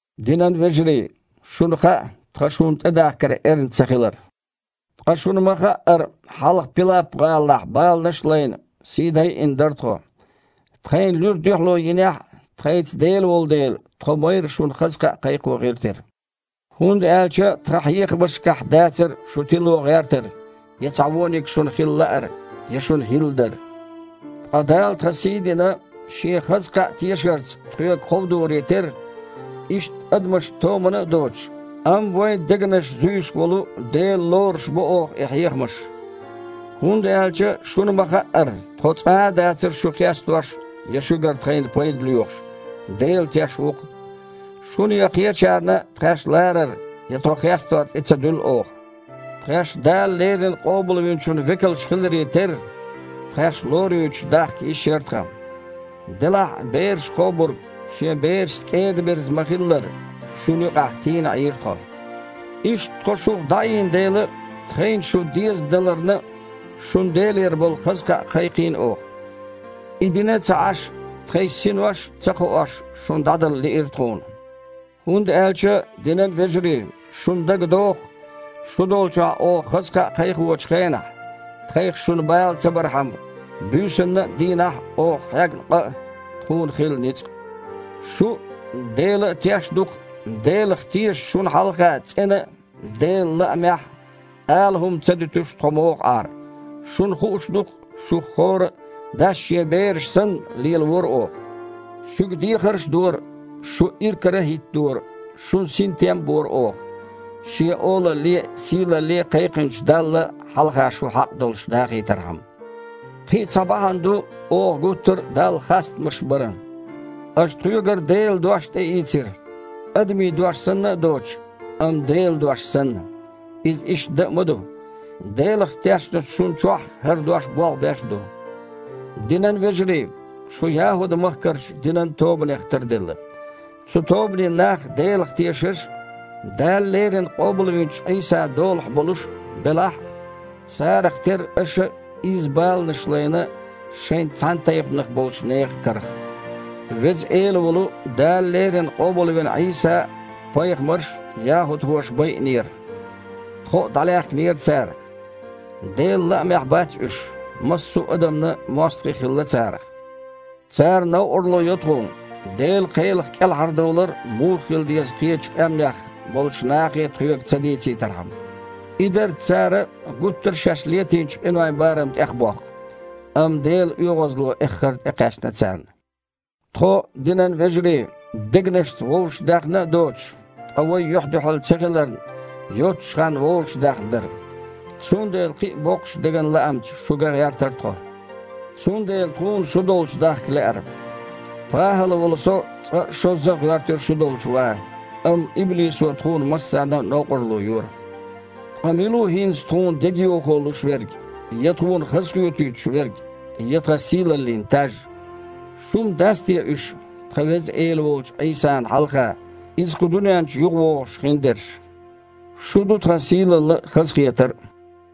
Динан вежарий, шуна хаьа, тхан шуна тІедахкар эрна ца хилар. Ткъа, шуна ма-хаъара, хьалха Пилап-гІалахь баланаш а лайна, сий дайина дара тхо. Тхайна луьра дуьхьало йинехь а, тхайца Дела волу дела, тхо майрра шуна хаза кхаъ кхайкхо гІиртира. ХІунда аьлча тхан хьехамашкахь дацара шу тило гІертар, я цхьа вониг шуна хила лаар, я шуна хІилла дар. Ткъа Дала тхан сий а дина, Шен хаза кхаъ тешарца тхоьга кховдоре терра, иштта, адамашна томана а доцуш, амма вайн дегнаш зуьйш волу Дела лоруш бо оха и хьехамаш. ХІунда аьлча, шуна ма-хаъара, тхо цкъа а дацара шу хестош я шуьгара тхайна пайда лоьхуш. Дела теш ву-кх! Шуна я кхечарна тхаьш ларар я тхо хестор тІе ца дуьллу оха. Тхаьш Дала леррина Къобалвинчун векалш хиларе терра, тхаьш лоруьйтуш дахка йиш яра тхан, делахь а, бераш кхобург шен берашца кІеда-мерза ма-хиллара, шуна юкъахь тийна Іийра тхо. Иштта тхо шух дІаийна дела а, тхайна шу дезадаларна а шуна Делера болу хаза кхаъ кхайкхийна оха. И дина а ца Іаш, тхайн синош а, ца кхоош, шуна дІадала лиира тхуна. ХІунда аьлча, динан вежарий, шуна дагадогІу-кх шу долчохь оха хаза кхаъ кхайкхочу хенахь, тхайх шуна бала ца бархьама, буьйсанна а, дийнахь а оха хьегна къа а, тхуна хилла ницкъ а. Шу а, Дела а теш ду-кх, Делах тешачу шуна хьалха цІена а, Делан лаамехь а, ала хІума а ца дуьтуш тхо муха Іара. Шуна хууш ду-кх, шух хІора а, дас шен бераш санна, лелавора оха. Шуьга дехарш а дора, шу иракара а хІиттадора, шуна синтем а бора оха, Шен Олалле а, сийлалле а кхайкхинчу Далла хьалха шу хьакъ долуш дахийтархьама. Кхин а цхьа бахьана ду, оха гуттара а Далла хастамаш баран. Аша тхоьгара Делан дош тІеийцира, адамийн дош санна а доцуш, амма Делан дош санна (иза иштта дан а ма ду). Делах тешначу шуна чохь хІара дош болх беш а ду. Динан вежарий, шу ЯхІуд-махкарчу динан тобанех тарделла. Цу тобанийн нах Делах тешаш а, Дала леррина къобалвинчу Іийсан долахь болуш а белахь а, цара шайн махкахошкахьара баланаш хьегна. Царах терра аша а изза баланаш лайна шайн цхьанатайпанах болчу нехан карах. Веза Эла волу Дала леррина къобалвина Іийса а, пайхамарш а яхІудхоша байинера. Тхо а дІалаьхкинера цара. Делан лаамехь бац уьш, массо а адамна мостагІий хилла царах. Цара новкъарло йо тхуна, Делан кхелах кІелхьардовлар муха хила деза кхечу къаьмнех болчу нахе тхоьга ца дийцийтархьама. И дарца цара гуттара а шаьш летийначу къинойн барам тІехбоккху, амма Делан оьгІазло эххар а тІекхаьчна царна. Тхо, динан вежарий, дегнашца вовшах даьхна а доцуш, ткъа вай юьхь-дуьхьал ца хиларна йоццучу ханна вовшахдаьхна дара, цундела кхин а боккхачу деган лаамца шу ган гІертара тхо. Цундела тхуна шу долчу дахка лаьара. ПахІал волу со цкъа а, шозза а гІоьртира шу долчу ван, амма иблисо тхуна массарна а новкъарло йора. Ткъа мила ву хІинца тхуна дегайовхо луш верг, я тхуна хазахоьтуьйтуш верг, я тхан сийлаллин таж? Шу-м дац те уьш, тхан Веза Эла волчу Іийсана хьалха, Иза кху дуьнен чу юхавогІуш, хиндерш? Шу ду тхан сийлалла а, хазахетар а.